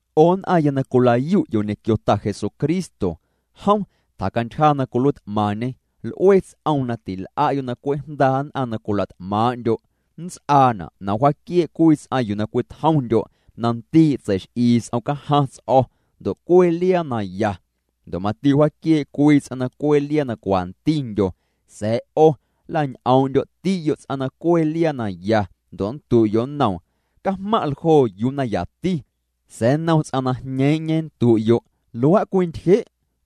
'O nn'aⁿya na cwila'yu'yo' ñequio Ta Jesucristo, jom tjacantyja na cwiluiit'maⁿñê. L'ue ts'oom na til'a'yo' na cwe' jndaa' nn'aⁿ na cwila't'maaⁿ'ndyo'. Nnts'aana' na wjaaquiee' cwii ts'aⁿ yuu na cwitjomndyo' na ndii' tseix'ii s'om cajaⁿ ts'o̱ ndo' cwee liaa na ya. Ndo' mati wjaaquiee' cwii ts'aⁿ na cwee liaa na cwantindyo, sa̱a̱ 'o nla'ñ'oom'ndyo'ti'yo' ts'aⁿ na cwee liaa na ya, ndo' nndu'yo' nnoom: “Cajmaⁿ' ljoo yuu na yati”, sa̱a̱ nnom ts'aⁿ na jñeeⁿ'ñe nndu'yo': “Luaa' cwintyje'”,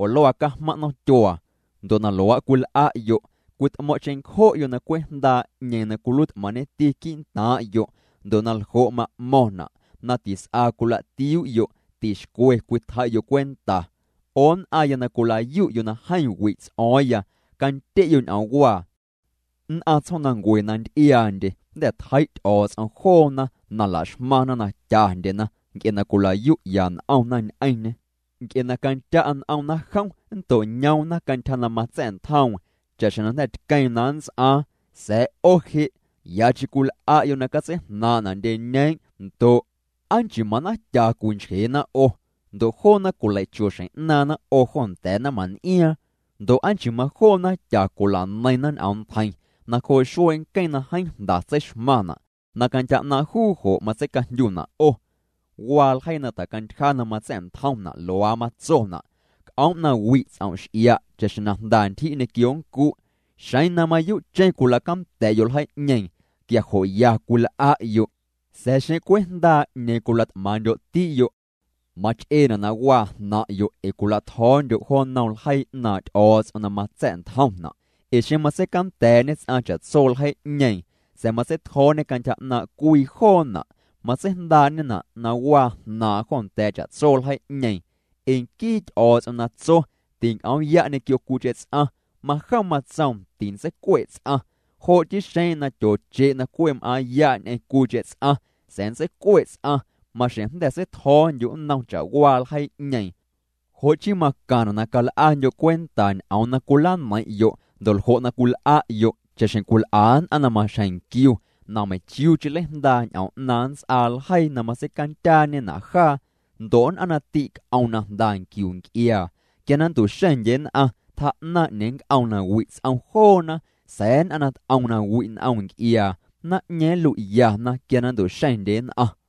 oo “Luaa' cajmaⁿ' nomtyuaa”, ndo' na luaa' cwil'a'yo' cwit'mo̱ⁿ' cheⁿncjo'yo' na cwe' jndaa' 'ñeeⁿ na cwiluiit'maⁿñeti quii'ntaaⁿ'yo', ndo' naljo' ma'mo̱ⁿna' na tis'a cwila'tiuu'yo', tixcwe cwitjei'yo' cwenta. 'O nn'aⁿya na cwila'yu'yo' na jeeⁿ wi' ts'o̱o̱ⁿya, candye'yo' ñ'oomwaa: Nn'aⁿ tsjoomnancue na nty'iaandye, jnda̱ tjei' Ty'o̱o̱ts'om joona na laxmaⁿna na tyandyena nc'e na cwila'yu'ya n'omna ñ'eⁿñê, nc'e na candya' n'omna jom, nnto'ñoomna cantyja na matsa̱'ntjoom cha'xjeⁿ na jnda̱ tqueeⁿ na nnts'aaⁿ. Sa̱a̱ 'o je', yacheⁿ cwil'a'yo' na catseijnaaⁿ'na' ndyeñeeⁿ' ndo' ¿aa nchii manaⁿtya cwinchjeena 'o? Ndo' joona cwilei'cho xjeⁿ'naaⁿna 'o jo nda̱a̱ naⁿmaⁿn'iaaⁿ. Ndo' aa chii majoo naⁿtya cwila'neiⁿna ñ'oomntjeiⁿ nacjoo' xuee nqueⁿ na jeeⁿ jnda tseixmaⁿna' na cantyja 'naaⁿ' juu jo' matseicajndyuna' 'o. Waa ljeii na tjacantyja na matsa̱'ntjomna'. Luaa matsona': “C'oom' na wi' ts'om' x'ia' cha'xjeⁿ na jnda ntyji' ñequio nncu'.” Xeⁿ na mayuu'cheⁿ cwila'canda̱'yo' ljeii'ñeeⁿ, quia jo' ya cwil'a'yo'. Sa̱a̱ xeⁿ cwe' jndaa' 'ñeeⁿ na cwila't'maaⁿ'ndyo'ti'yo', mach'eena' na waa jnaⁿ'yo' ee cwila'tjo̱o̱ndyo' jo nnom ljeii 'naaⁿ' Ty'o̱o̱ts'om na matsa̱'ntjomna'. Ee xeⁿ matseicanda̱a̱'ñe ts'aⁿ cha'tso ljeii'ñeeⁿ, sa̱a̱ matseitjo̱o̱ñe cantyja 'naaⁿ' cwii joona', matseijndaa'ñena' na waa jnaaⁿ'aⁿ jo nda̱a̱ cha'tso ljeii'ñeeⁿ. Ee nquii Ty'o̱o̱ts'om na tso: “Tinc'oom'ya' ñequio cwiicheⁿ ts'aⁿ”, majom matsoom: “Tintseicue' ts'aⁿ.” Jo' chii xeⁿ na tyooche' na cwe' m'aaⁿ'ya' ñ'eⁿ cwiicheⁿ ts'aⁿ, sa̱a̱ nntseicue' ts'aⁿ, maxjeⁿ jnda̱ seitjo̱o̱ndyu' nnom cha'waa ljeii'ñeeⁿ. Jo' chii macaⁿna' na cal'andyo' cwenta ñ'oom na cwila'neiⁿ'yo', ndo' ljo' na cwil'a'yo', cha'xjeⁿ cwil'a nn'aⁿ na maxjeⁿ nquiu na meiⁿchiuucheⁿ nleijndaa' ñ'oom 'naaⁿ nnts'aa ljeii na matseicandyaañena' jaa. Ndo' nn'aⁿ na tîc'om na jnda nquiu nc'iaa, quia na nntu'xeⁿndye nn'aⁿ, tjaa'naⁿ 'ñeeⁿ nnc'oom na wi' ts'om joona. Sa̱a̱ nn'aⁿ na t'om na wi' n'om nc'iaa, naⁿ'ñeeⁿ nlui'yana quia na nntu'xeⁿndye nn'aⁿ.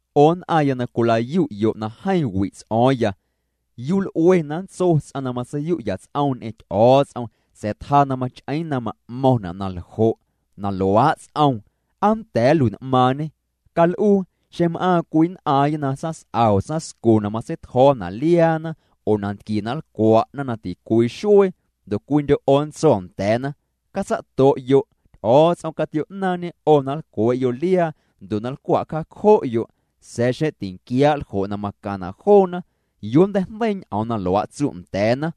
'O nn'aⁿya na cwila'yu'yo' na jeeⁿ wi' ts'o̱o̱ⁿya, ¿yuu l'ue na nntso ts'aⁿ na matseiyu'ya ts'oom ñ'eⁿ Ty'o̱o̱ts'om, sa̱a̱ tjaa na mach'eeⁿ na ma'mo̱ⁿna' na ljo'? Na luaa' ts'oom, ¿aa nnda̱a̱ nlui'n'maaⁿñê? Cal'uu, xeⁿ m'aaⁿ cwii nn'aaⁿya na tsaⁿs'a oo tsaⁿscu na matseitjo̱o̱na' liaana ndo' nantquie na nlcwa'na na ticwii xuee, ndo' cwiindyo' 'o nntso nda̱a̱na: “Catsa'to'yo'.” Ty'o̱o̱ts'om catio'naaⁿñê 'o na nlcwee'yo' liaa ndo' na nlcwa'cjaacjo'yo', sa̱a̱ xeⁿ tinquiaa' ljo' na macaⁿna' joona, ¿yuu nnteijndeii ñ'oom na luaa' tsu' nda̱a̱na?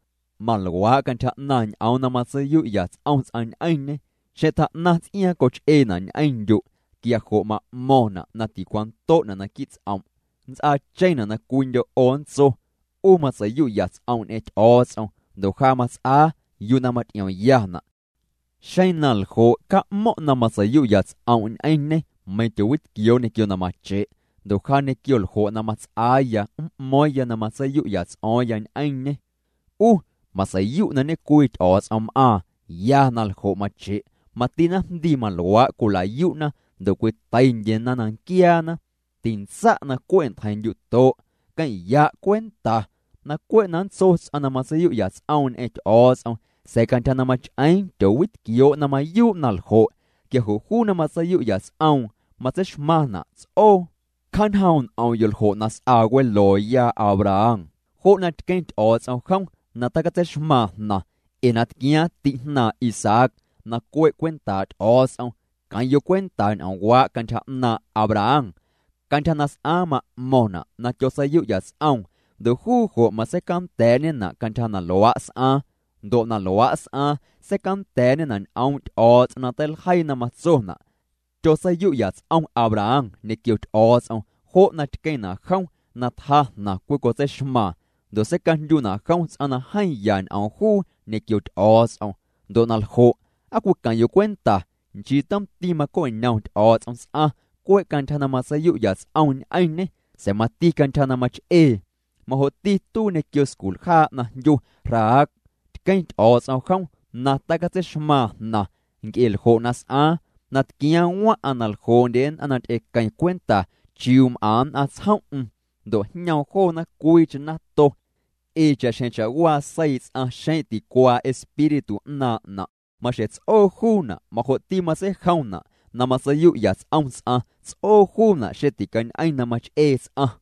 Maluaa' cantyja 'naaⁿ' ñ'oom na matseiyu'ya ts'om' ñ'eⁿñê xeⁿ tjaa'naⁿ ts'iaaⁿ coch'eena' ñ'eⁿndyu' quia jo' ma'mo̱ⁿna' na ticwando'na' naquii' ts'om'. Nnts'aacheⁿna' na cwiindyo' 'o nntso: “'U matseiyu'ya ts'om' ñ'eⁿ Ty'o̱o̱ts'om ndo' ja mats'aa yuu na maty'iommyana'.” Xeⁿ na ljo', ca'mo̱ⁿ' na matseiyu'ya ts'om' ñ'eⁿñê meiⁿ tyoowitquioo' ñequio na mache', ndo' ja ñequio ljo' na mats'aaya m'mo̱o̱ⁿya na matseiyu'ya ts'o̱o̱ⁿya ñ'eⁿñê. 'U matseiyu' na ñecwii Ty'o̱o̱ts'om m'aaⁿ, ya na ljo' mache', mati naⁿjndii maluaa' cwila'yu'na ndo' cwiteindyena na nquiaana. Tintsa' na cwe' ntjeiⁿndyu'to', queⁿ'ya' cwenta. Na cwe' na nntso ts'aⁿ na matseiyu'ya ts'oom ñ'eⁿ Ty'o̱o̱ts'om, sa̱a̱ cantyja na mach'eeⁿ tyoowitquioo' na mayuu' na ljo', quia jo' juu na matseiyu'ya ts'om', matseixmaⁿna' ts'oo. Cjaañjoom' n'om'yo' ljo' na s'aa welooya Abraham, jo' na tqueⁿ Ty'o̱o̱ts'om jom na tacatseixmaaⁿ jnaⁿ ee na tquiaaⁿ ti'jnaaⁿ Isaac na cue' cwentaa' Ty'o̱o̱ts'om. Queⁿ' cwenta ñ'oomwaa' cantyja 'naaⁿ' Abraham, cantyja na s'aaⁿ ma'mo̱ⁿna' na tyotseiyu'ya ts'oom ndo' juu jo' matseicanda̱a̱'ñena' cantyja na luaa' s'aaⁿ. Ndo' na luaa' s'aaⁿ seicanda̱a̱'ñena' ñ'oom' Ty'o̱o̱ts'om na teiljeii na matsona': “Tyotseiyu'ya ts'om Abraham ñequio Ty'o̱o̱ts'om, jo' na tqueⁿna' jom na tjaa jnaⁿ cwicotseixmaaⁿ, ndo' seicajndyuna' jom ts'aⁿ na jeeⁿ ya ñ'oom juu ñequio Ty'o̱o̱ts'om.” Ndo' na ljo', ¿aa cwiqueⁿ'yo' cwenta? Nchii tomti maco'ñom Ty'o̱o̱ts'om ts'aⁿ cwe' cantyja na matseiyu'ya ts'om ñ'eⁿñê sa̱a̱ mati cantyja na mach'ee. Majo'ti tuii ñequio sculjaa' na jndyu Rahab, tqueⁿ Ty'o̱o̱ts'om jom na tacatseixmaaⁿ jnaⁿ nc'e ljo' na s'aaⁿ, na tquiaaⁿ waⁿ'aⁿ na ljoo'ndye nn'aⁿ na ty'equeⁿ cwenta chiuu m'aⁿ nn'aⁿ tsjom'm, ndo' jñoom joona cwiicheⁿ nato. Ee cha'xjeⁿ cha'waa seii' ts'aⁿ xeⁿ ticuaa espíritu 'naaⁿ'na', maxjeⁿ ts'oo juuna', majo'ti matseijomna' na matseiyu'ya ts'om ts'aⁿ, ts'oo juuna' xeⁿ ticañ'eⁿ na mach'ee ts'aⁿ.